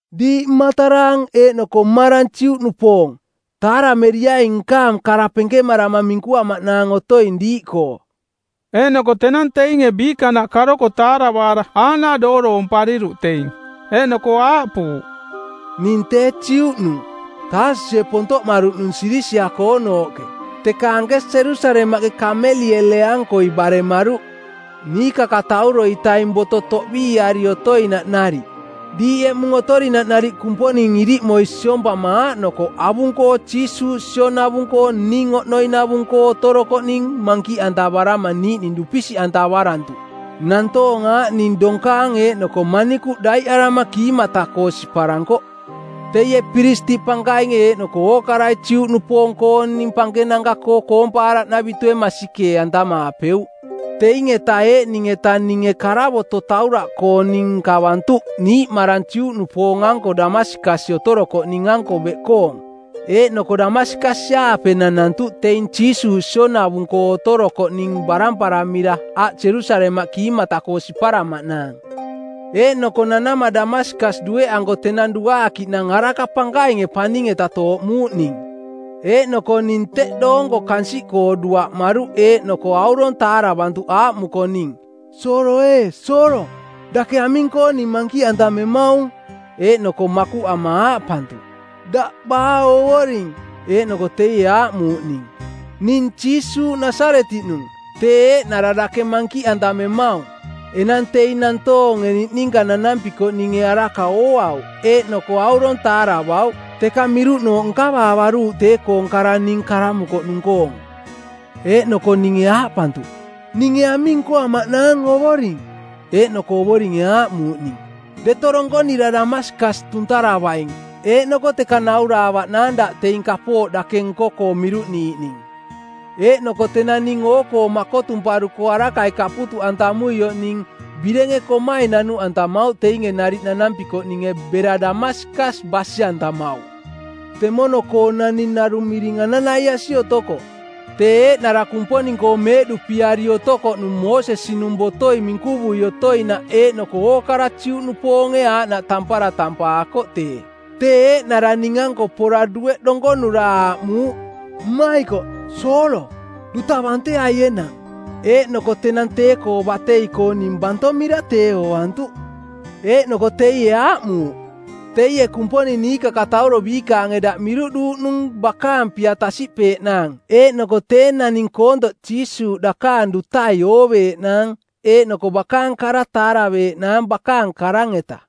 “Diiꞌ mmataraang eeꞌnoko mmarang Juꞌnupoong, taarameriaing nkaang kara penkemarama minkuamaꞌnaang otoing diiꞌkoo.” Eeꞌnoko tenang teinge biikanaꞌ karoko taaravaara aaꞌnaꞌ dooroompariruꞌ teing. Eeꞌnoko aaꞌpuuꞌ, “Ning tee Juꞌnung, Taasusie pontoꞌmaruꞌnung Silisia-koonooꞌke, teka anke Jerusalemaꞌke Kameliele-ankoi baremaruꞌ, niikakatauro-itaing boto toꞌbiiari otoinaꞌ nariꞌ; Diiꞌ eꞌmung otorinaꞌ nariꞌ Kumponing iriꞌmoi siompama aaꞌnokoꞌ avung-koo Jiisuuꞌ sionavung-koo ning oꞌnoinavung-koo otorokoꞌning mankiꞌantavarama niiꞌning dupisiꞌantavarantuꞌ. Nantoong aaꞌning donkaang eeꞌnoko manikuꞌ daiꞌarama kiimata-koo siparankoꞌ. Teie piristiꞌ pankainge eeꞌnoko ookarai Juꞌnupoong-kooning pankenanka-koo koompaaraꞌnavitue masikee-antamaapeuꞌ. Teing-eta eeꞌning-eta ninge karavoto˜ tauraꞌkooning nkavantuꞌ niiꞌmarang Juꞌnupoong-anko Damaskas otorokoꞌning-anko beꞌkoong. Eeꞌnoko Damaskas-aape nanantuꞌ teing Jiisuuꞌ sionavung-koo otorokoꞌning baramparamira aꞌ Jerusalemaꞌ kiimata-koo siparamaꞌnaang.” “Eeꞌnoko nanama Damaskas dueꞌanko tenang duaakiꞌnang araka pankainge paning-eta tooꞌmuuꞌ ning. Eeꞌnoko ning teꞌ doonko kansiꞌkoo duaꞌmaruꞌ eeꞌnoko aurong taaravantuꞌ aaꞌmuko ning, ‘Soolo ee, Soolo, dake aming-koo ning mankiꞌantamemaung?’ Eeꞌnoko makuꞌama aaꞌpantuꞌ, ‘Daꞌ baa Ovoring?’ Eeꞌnoko teie aaꞌmuuꞌ ning, ‘Ning Jiisuuꞌ, Nasaretiꞌnung, tee eeꞌnara dake mankiꞌantamemaung.’ “Enang teing nantoonge niꞌninka nanampikoꞌninge araka ooauꞌ, eeꞌnoko aurong taaravauꞌ, teka miruꞌnooꞌ nkavaavaruuꞌ tee-koong kara ning karamukoꞌnung-koong. Eeꞌnoko ninge aaꞌpantuꞌ, ‘Ninge aming nkoamaꞌnaang Ovoring?’ Eeꞌnoko Ovoringe aaꞌmuuꞌ ning, ‘Deto donkonira Damaskas tuntaravaing eeꞌnoko teka nauraavaꞌnaang daꞌ teing kapooꞌ dake nko-koo miruꞌniiꞌning.’ “Eeꞌnoko tenang ning oo-koo makotumparuko arakai kaputuꞌantamuioꞌ ning birenge komai nanuꞌantamauꞌ teinge nariꞌ nanampikoꞌninge bera Damaskas basi-antamauꞌ. Temono-koo naning narung miring Ananaiasi otokoꞌ, tee eeꞌnara Kumponing-koo meeꞌduꞌpiari otokoꞌnung Moosesi-nung botoi minkuvui otoinaꞌ eeꞌnoko ookarai Juꞌnupoonge aaꞌnaꞌ tampara tampaakoꞌ tee. Tee eeꞌnara ning-anko pora dueꞌ donkonura aaꞌmuuꞌ, ‘Mmaikoꞌ, Soolo, duta banteai enang.’ Eeꞌnoko tenang tee-koo batei-koo ning bantomira tee ooantuꞌ. “Eeꞌnoko teie aaꞌmuuꞌ, ‘Teie Kumponing niikakatauro biikaange daꞌ miruꞌduuꞌnung bakaang pia tasiꞌpeeꞌnaang eeꞌnoko tee naning koontoꞌ Jiisuuꞌ dakaang dutai ooveeꞌnaang eeꞌnoko bakaang kara taaraveeꞌnaang bakaang karang-eta.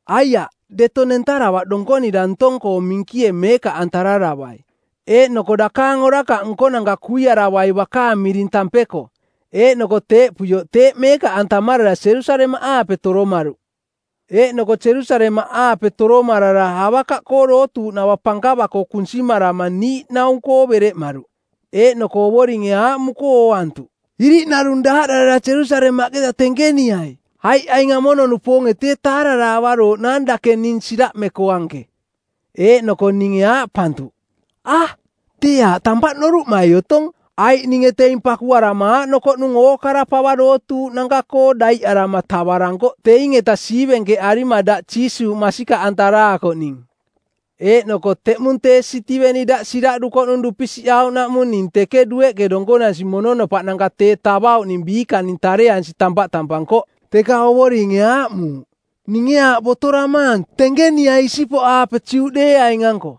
Aiaꞌ deto nentaravaꞌ donkonira ntong-koo minkie meekaꞌantararavai, eeꞌnoko dakaang orakaꞌ nkonanka kuiaravai bakaang miring tampeko.’ Eeꞌnoko teeꞌpuioꞌ teeꞌ meekaꞌantamarara Jerusalemaꞌaape toromaruꞌ.” “Eeꞌnoko Jerusalemaꞌaape toromarara avakaꞌkoo dootuuꞌnava pankava-koo kunsimarama niiꞌnaung-koo˜ bereꞌmaruꞌ. Eeꞌnoko Ovoringe aaꞌmuko ooantuꞌ, ‘Iriꞌnarung daaꞌdarara Jerusalemaꞌketa tenkeniai, aiꞌ aing amono-nupoonge tee taararaavarooꞌnaang dake ning siraꞌmeko anke.’ “Eeꞌnoko ninge aaꞌpantuꞌ, ‘A, tee aaꞌ tampaꞌ noruꞌmai otong, aiꞌ ninge teing pakuarama aaꞌnokoꞌnung ookara pava dootuuꞌnanka-koo daiꞌarama tavarankoꞌ teing-eta siivenkeꞌarima daꞌ Jiisuuꞌ masikaꞌantaraakoꞌning. Eeꞌnoko teꞌmung tee Sitiveni daꞌ siraꞌdukoꞌnung dupisiꞌauꞌnaꞌmung ning teke dueꞌke donkonansi mononopaꞌnanka tee tavauꞌning biikaning tareansi tampaꞌ tampankoꞌ.’ Teka Ovoringe aaꞌmuuꞌ, ‘Ninge aaꞌ botoramaang, tenkeniai isipoꞌaape Juꞌdeeaing-anko.’”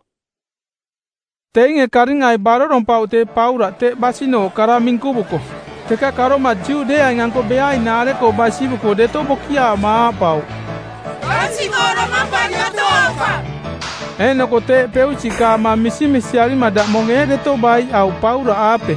Teinge karingai barorompauꞌ tee Paulaꞌke teꞌ basinooꞌ kara minkuvuko, teka karoma Juꞌdeeaing-anko beainaare-koo basivuko deto bokiaama aaꞌpauꞌ, “Kansiꞌkoo domampari otoaukaꞌ!” Eeꞌnoko teeꞌ peusiꞌkaama misimisiarima daꞌmong eeꞌ deto baiꞌauꞌ Paulaꞌaape.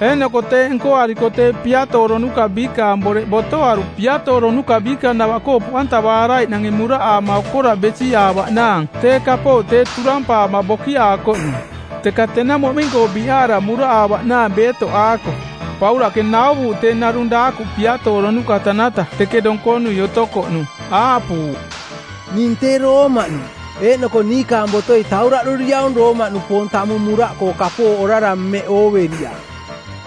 Eeꞌnoko teeꞌ nkoariko tee piatooronuka biikaang boreꞌ botoaruꞌ piatooronuka biikanavaꞌkoo poꞌantavaaraiꞌnange muraꞌaama okoraꞌ besiꞌaavaꞌnaang tee kapooꞌ tee turampaama bokiaakoꞌnung. Teka tenang moꞌming-koo biꞌaara muraꞌaavaꞌnaang beetoꞌaako Paulaꞌke nauvuuꞌ tee narung daakuꞌ piatooronuka tanata teke donkonui otokoꞌnung, aaꞌpuuꞌ, “Ning tee Roomaꞌnung, eeꞌnoko niikaang botoi tauraꞌduriaung Roomaꞌnupoong tamung muraꞌkoo kapooꞌ orara mmeꞌ ooveriaꞌ.”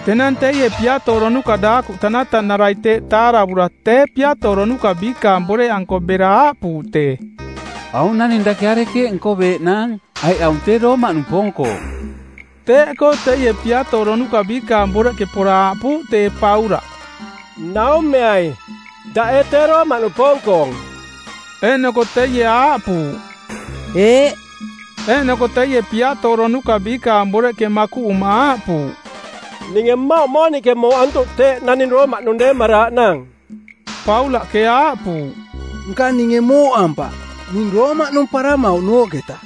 Tenang teie piatooronuka daakuꞌ tanatanarai teeꞌ taaravura tee piatooronuka biikaang boreꞌanko bera aaꞌpuuꞌ tee, “Aung naning dake arekeeꞌ nkoveeꞌnaang, aiꞌ aung tee Roomaꞌnupoong-koong.” Teeꞌkoo teie piatooronuka biikaang boreꞌke pora aaꞌpuuꞌ tee Paulaꞌ, “Naumeai, daꞌ ee tee Roomaꞌnupoong-koong?” Eeꞌnoko teie aaꞌpuuꞌ, “Eeꞌ.” Eeꞌnoko teie piatooronuka biikaang boreꞌke makuꞌuma aaꞌpuuꞌ, “Ninge mmauꞌ mooniꞌke mooꞌantuꞌ teeꞌ naning Roomaꞌnung deemaraaꞌnaang.” Paulaꞌke aaꞌpuuꞌ, “Nka ninge mooꞌampaꞌ, ning Roomaꞌnung paramauꞌnooꞌketa.”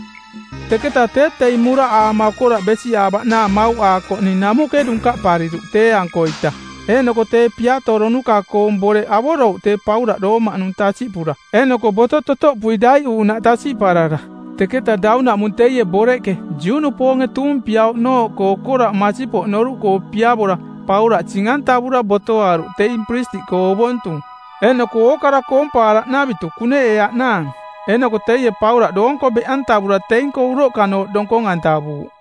Teketa tee teing muraꞌaama okoraꞌ besiꞌaavaꞌnaang mauꞌaakoꞌning namuꞌke dunkaꞌpariruꞌ tee-ankoita. Eeꞌnoko tee piatooronuka-koong boreꞌ avorouꞌ tee Paulaꞌ Roomaꞌnung tasiꞌpura eeꞌnoko boto totoꞌpui daiꞌuuꞌnaꞌ tasiꞌparara. Teketa daunaꞌmung teie boreꞌke Juꞌnupoonge tuumpiauꞌnooꞌkoo okoraꞌ masipoꞌ noruꞌkoo piavora, Paulaꞌ sing-antavura botoaruꞌ teing piristiꞌkoo ovontung eeꞌnoko ookara koompaaraꞌnavitu kuneꞌeeaꞌnaang. Eeꞌnoko teie Paulaꞌ doonko beꞌantavura teing-koo uroꞌkanooꞌ donkong-antavuuꞌ.